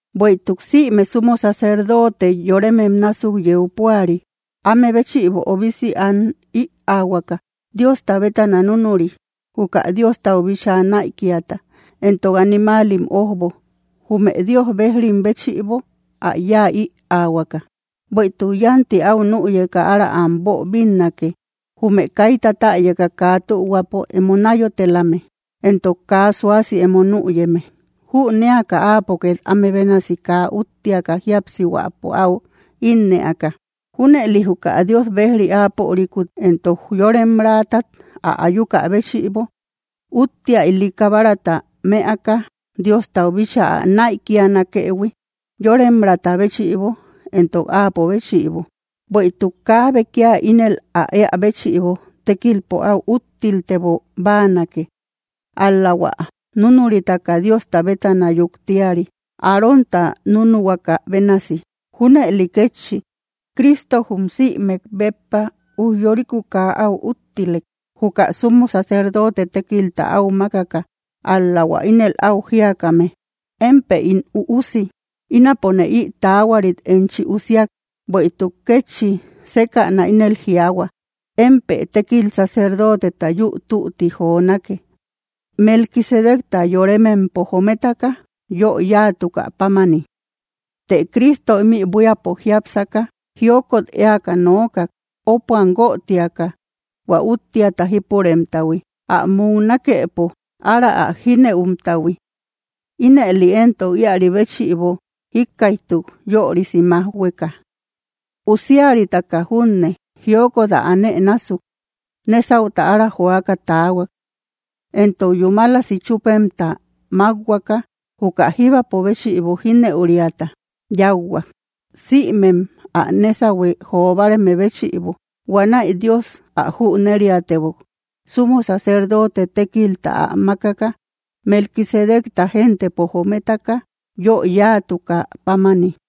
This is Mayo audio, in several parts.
Bueïtuk sïme sumo sacerdote yoremem násuk yeu púari, áme béchïbo obisi an ïaahuaka Diosta bétana núnuri, juka Diostau bíchaa näikiata entok animaalim ójbo, jume Dios bejrim béchïbo ä yáa ïahuaka. Bueïtuk yánti áu nüyeka ára am boobinnake, jume kaita täyaka kaa tühuapo emo náyotelame entok kaa suasi emo nüyeme, jünéaka áapo két áme bénasi kaa úttiaka jíapsihuäpo áu ínnëaka. Júneli juka Dios bejri áapörikut éntok yoremraatat ä ayuka béchïbo, úttia ili kabarata mëaka Diostau bíchaa ä näikianakëhui, yoremraata béchïbo entok áapo béchïbo. Bueïtuk kaabe kia ínel ä éä béchïbo tékilpo áu úttiltebo báanake, ál‑la hua núnuritaka Diosta bétana yuktiari, Arónta núnuhuaka bénasi. Júnëli kétchi Cristo jum sïmek béppa ujyoriku kaa áu úttilek, juka sumo sacerdote tékilta áu mákaka, ál‑la hua ínel áu jíakame: Émpë ín Üusi; ínapone ï taahuarit enchi usiak. Bueïtuk kétchi sékäna ínel jiaahua: Émpë tékil sacerdoteta yúu tütti jonake, Melquisedecta yoremempo jometaka yö yáatukä pámani. Të Cristo ímï buíapo jiápsaka, jiokot éaka nookak, ópuam guötiaka hua úttiata jípuremtahui, ä muknakepo ára ä jínëumtahui. Ínëli éntok íäri béchïbo jíkkaïjtuk, yörisi májhueka. Usiaritaka junne, jiokot ä anë násuk, nésauta ára joaka taahuak. Entok yúmalasi chúpemta mákhuaka, juka jíbapo béchïbo jínëuriata yáuhuak, sïmem ä nésahui jo báareme béchïbo. Huanäi Dios ä jüneriatebok, sumo sacerdote tékilta ä mákaka, Melquisedecta gentepo jometaka yö yáatukä pámani.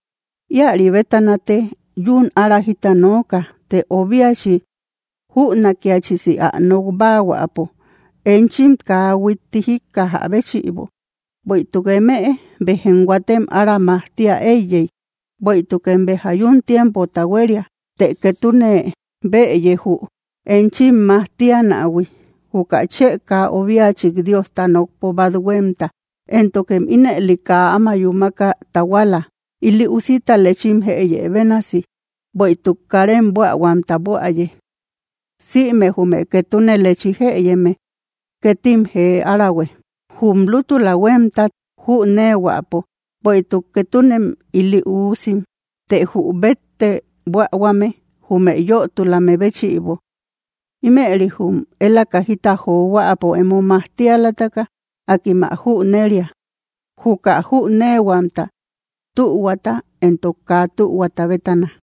Íäri bétanate yún ára jita nooka, të obiachi jünakiachisi ä nok báahuäpo, enchim kaa huitti jíkkajä béchïbo. Bueïtuk eme béjem huatem ára majtia éiyey, bueïtukem béja yún tiempota huéria. Të ketune bëye jü enchim majtianähui, juka chë kaa obiachik Diosta nokpo bát huémta. Éntokem ínëli kaa áma yúmaka tahuala, ili usita lechim jëyë bénasi; bueïtuk karem buähuamta buäye. Sïme jume ketune lechi jëyeme ketim jee árahue, jum lútula huémtat jüneehuäpo; bueïtuk ketunem ili uusim. Të jü bette buähuame jume yötulame béchïbo. Ímëri jum élaka jita johuäpo emo majtialataka, akim ä jüneria, juka jüneehuamta, tühuata entok kaa tühuata bétana.